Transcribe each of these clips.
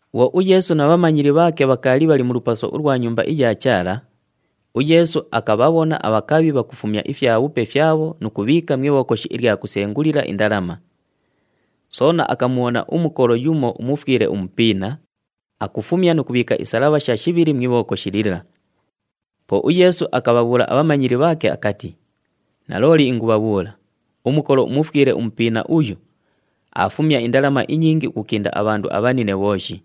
Bhwo uYeesu na bhamanyili bhaake bhakaali bhali mu lupaso ulwa Nyumba iya Chaala, uYeesu akabhabhona abhakabhi bhakufumya ifyabhupe fyabho nu kubhiika mu ibhokoshi ilya kusengulila indalama. Soona akamubhona umukolo yumo umufwile umupiina, akufumya nu kubhiika isalabhasha shibhili mu ibhokoshi lila. Po uYeesu akabhabhuula abhamanyili bhaake akati, “Nalooli ingubhabhuula, umukolo umufwile umupiina uyu, aafumya indalama inyingi ukukinda abhandu abhanine bhooshi.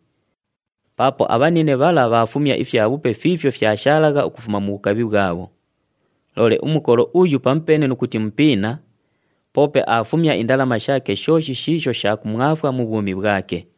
Paapo abhanine bhala bhaafumya ifyabhupe fiifyo fyashaalagha ukufuma mu bhukabhi bhwabho. Loole umukolo uyu pamupeene nu kuti mupiina, poope aafumya indalama shaake shooshi shiisho sha kumwafwa mu bhwumi bhwake!”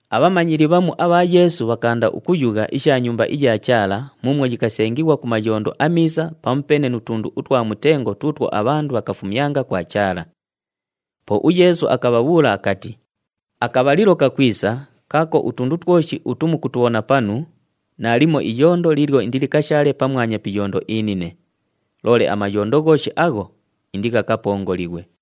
Abhamanyili bhamu abha Yeesu bhakaanda ukuyugha isha Nyumba iya Chaala muumwo yikasengighwa ku mayondo amiisa pamupeene nu tundu utwa mutengo tuutwo abhandu bhakafumyanga kwa Chaala. Po uYeesu akabhabhuula akati, “Akabhalilo kakwisa kaako twoshi utu mukutubhona panu, naalimo iyondo liilyo indilikashaale pamwanya pi iyondo inine. Loole amayondo ghooshi agho, indighakapongolighwe!”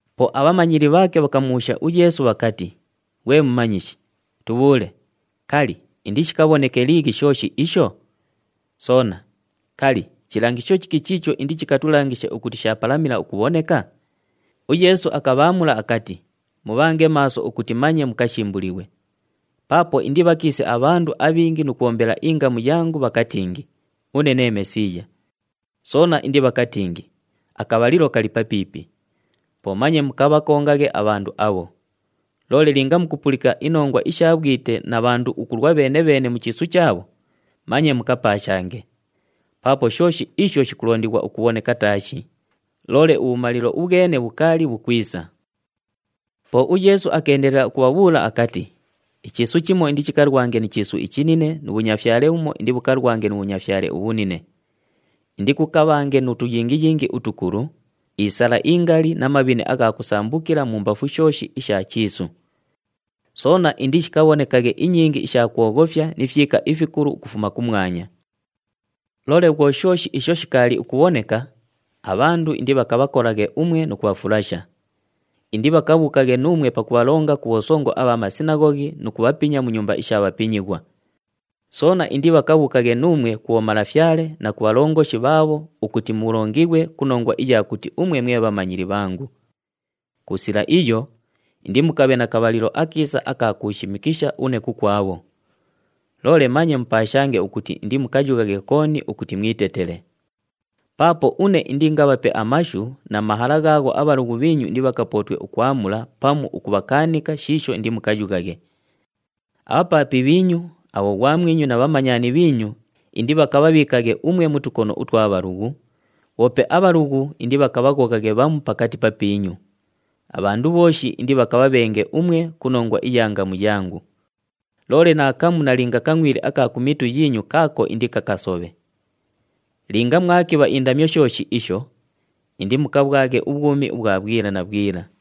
Po abhamanyili bhaake bhakamubhuusha uYeesu bhakati, “Ghwe Mumanyishi, tubhuule, kali, indishikabhoneke liighi shooshi isho? Soona, kali, chilangisho chiki chiicho indichikatulangishe ukuti shaapalamila ukubhoneka?” UYeesu akabhaamula akati, “Mubhange maaso ukuti manye mukashimbulighwe! Paapo indibhakiise abhandu abhingi nu kubhombela ingamu yangu, bhakatingi, ‘Une nee Mesiiya.’ Soona indibhakatingi, ‘Akabhalilo kali papiipi!’ Po manye mukabhakongaghe abhandu abho! Loole linga mukupulika inongwa isha bhwite na bhandu ukulwa bheene-bheene mu chiisu chaabho, manye mukapaashange. Paapo shooshi isho shikulondighwa ukubhoneka taashi, loole ubhumalilo ubhwene bhukaali bhukwisa.” Po uYeesu akeendelela ukubhabhuula akati, “Ichiisu chimo indichikalwange ni chiisu ichinine nu bhunyafyale bhumo indibhukalwange nu bhunyafyale ubhunine. Indikukabhange nu tuyingiyingi utukulu, isala ingali na mabhine agha kusambukila mumbafu shooshi isha chiisu. Soona indishikabhonekaghe inyingi isha kwoghofya ni fyika ifikulu ukufuma kumwanya. “Loole bhwo shooshi isho shikaali ukubhoneka, abhandu indibhakabhakolaghe umwe nu kubhafulasha. Indibhakabhuukaghe nuumwe pakubhalonga ku bhosongo abha masinaghoghi nu kubhapinya mu nyumba isha bhapinyighwa. Soona indibhakabhuukaghe nuumwe ku bhomalafyale na ku bhalongoshi bhaabho ukuti mulongighwe ku nongwa iya kuti umwe mwe bhamanyili bhangu. Ku sila iyo, indimukabhe na kabhalilo akiisa aka kuushimikisha une kukwabho. Loole manye mupaashange ukuti indimukayughaghe kooni ukuti mwitetele. Paapo une indiingabhape amashu na mahala ghaagho abhalughu bhiinyu indibhakapootwe ukwamula pamu ukubhakaanika shiisho indimukayughaghe. Abhapaapi bhiinyu, abhoghwamwinyu na bhamanyani bhiinyu indibhakabhabhiikaghe umwe mu tukono utwa bhalughu, bhoope abhalughu indibhakabhaghoghaghe bhamu pakati papiinyu. Abhandu bhooshi indibhakabhabhenge umwe ku nongwa iya ngamu yangu. Loole naakamu nalinga kangʼwili aka ku mitu yiinyu kaako indikakasobhe. Linga mwakibha indamyo shooshi isho, indimukabhwaghe ubhwumi ubhwa bhwila na bhwila.”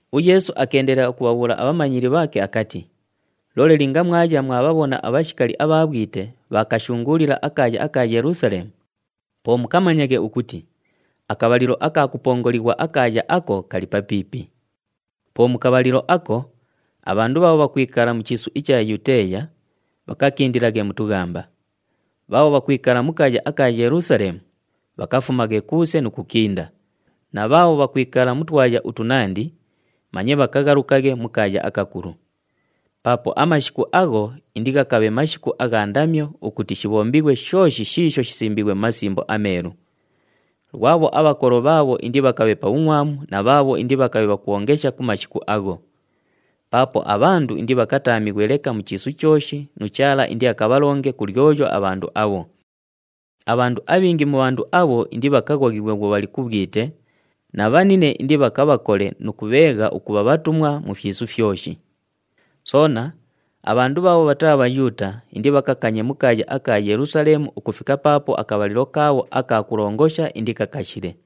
UYeesu akeendelela ukubhabhuula abhamanyili bhaake akati, “Loole linga mwaya mwabhabhona abhashikali abha bhwite bhaakashunguulila akaaya aka Yelusaleemu, po mukamanyaghe ukuti akabhalilo aka kupongolighwa akaaya ako kali papiipi. Po mu kabhalilo ako, abhandu bhaabho bhakwikala mu chiisu icha Yuteeya, bhakakindilaghe mu tughamba, bhaabho bhakwikala mu kaaya aka Yelusaleemu, bhakafumaghe kuuse nu kukinda, na bhaabho bhakwikala mu twaya utunandi, manye bhakaghalukaghe mu kaaya akakulu. Paapo amashiku agho indighakabhe mashiku agha ndamyo ukuti shibhombighwe shooshi shiisho shisimbiighwe mu Masimbo aMeelu. Lwabho abhakolo bhaabho indibhakabhe pa bhungʼwamu na bhaabho indibhakabhe bhakwongesha ku mashiku agho! Paapo abhandu indibhakataamighwe leka mu chiisu chooshi nu Chaala indiakabhalonge ku lyoyo abhandu abho. Abhandu abhingi mu bhandu abho indibhakaghoghighwe bhwo bhali ku bhwite na bhanine indibhakabhakole nu kubheegha ukubha bhatumwa mu fyisu fyoshi. Soona, abhandu bhaabho bhataa Bhayuuta indibhakakanye mu kaaya aka Yelusaleemu ukufika paapo akabhalilo kaabho aka kulongosha indikakashile.”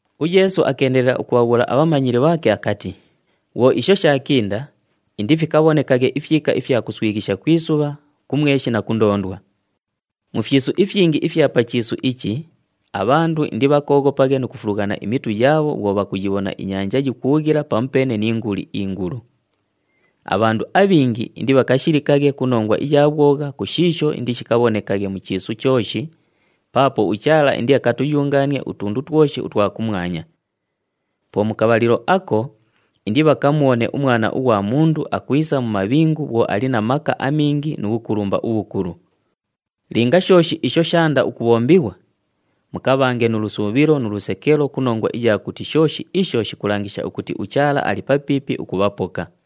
UYeesu akeendelela ukubhabhuula abhamanyili bhaake akati, “Bhwo isho shaakinda, indifikabhonekaghe ifyika ifya kuswighisha ku isubha, ku mweshi na ku ndoondwa. Mu fyisu ifyingi ifya pa chiisu ichi abhandu indibhakooghopaghe nu kufulughana imitu yaabho bhwo bhakuyibhona inyanja yikuughila pamupeene ni nguli ingulu. Abhandu abhingi indibhakashilikaghe ku nongwa iya bhwogha ku shiisho indishikabhonekaghe mu chiisu chooshi, paapo uChaala indiakatuyungaanie utundu twoshi utwa kumwanya. Po mu kabhalilo ako indibhakamubhone uMwana ughwa Mundu akwisa mu mabhingu bhwo ali na maka amingi nu bhukulumba ubhukulu. Linga shooshi isho shaanda ukubhombighwa, mukabhange nu lusuubhilo nu lusekelo ku nongwa iya kuti shooshi isho shikulangisha ukuti uChaala ali papiipi ukubhapoka!”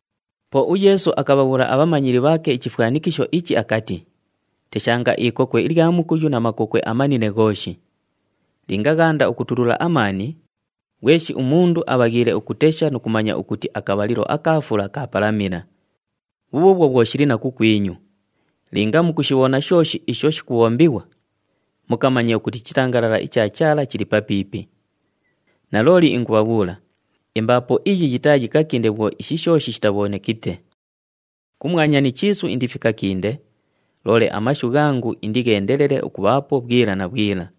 Po uYeesu akabhabhuula abhamanyili bhaake ichifwanikisho ichi akati, “Teshanga ikokwe ilya mukuyu na makokwe amanine ghooshi. Linga ghaanda ukutulula amaani, ghweshi umundu abhaghiile ukutesha nu kumanya ukuti akabhalilo aka fula kaapalamila. Bhubhuubhwo bhwo shili na kukwinyu, linga mukushibhona shooshi isho shikubhombighwa, mukamanye ukuti ichitangalala icha Chaala chili papiipi. Nalooli ingubhabhuula, imbaapo iyi yitaayikakinde bhwo ishi shooshi shitabhonekite. Kumwanya ni chiisu indifikakinde, loole amashu ghangu indigheendelele ukubhaapo bhwila na bhwila.”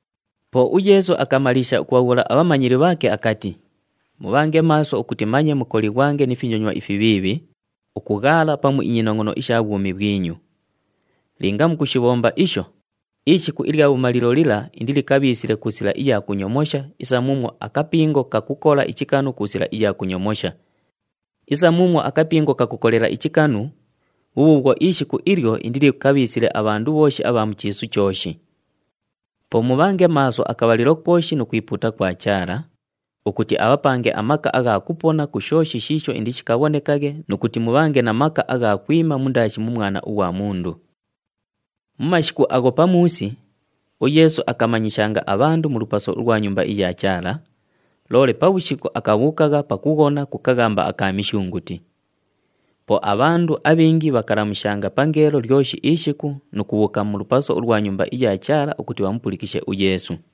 Po uYeesu akamaliisha ukubhabhuula abhamanyili bhaake akati, “Mubhange maaso ukuti manye mukolighwange ni finyonywa ifibhiibhi, ukughaala pamu inyinongʼono isha bhwumi bhwinyu. Linga mukushibhomba isho, ishiku ilya bhumalilo lila indilikabhiisile ku sila iya kunyomosha isa muumwo akapingo kakukola ichikanu ku sila iya kunyomosha. Isa muumwo akapingo kakukolela ichikanu, bhubhuubhwo ishiku ilyo indilikabhiisile abhandu bhooshi abha mu chiisu chooshi. Po mubhange maaso akabhalilo kooshi nu kwipuuta kwa Chaala, ukuti abhapange amaka agha kupona ku shooshi shiisho indishikabhonekaghe nu kuti mubhange na maka agha kwima mundaashi mu Mwana ughwa Mundu.” Mu mashiku agho pamuusi, uYeesu akamanyishanga abhandu mu lupaso ulwa Nyumba iya Chaala, loole pabhushiku akabhuukagha pakughona ku kaghamba aka Mishunguti. Po abhandu abhingi bhakalamushanga pangeelo lyoshi ishiku nu kubhuuka mu lupaso ulwa Nyumba iya Chaala ukuti bhamupulikishe uYeesu.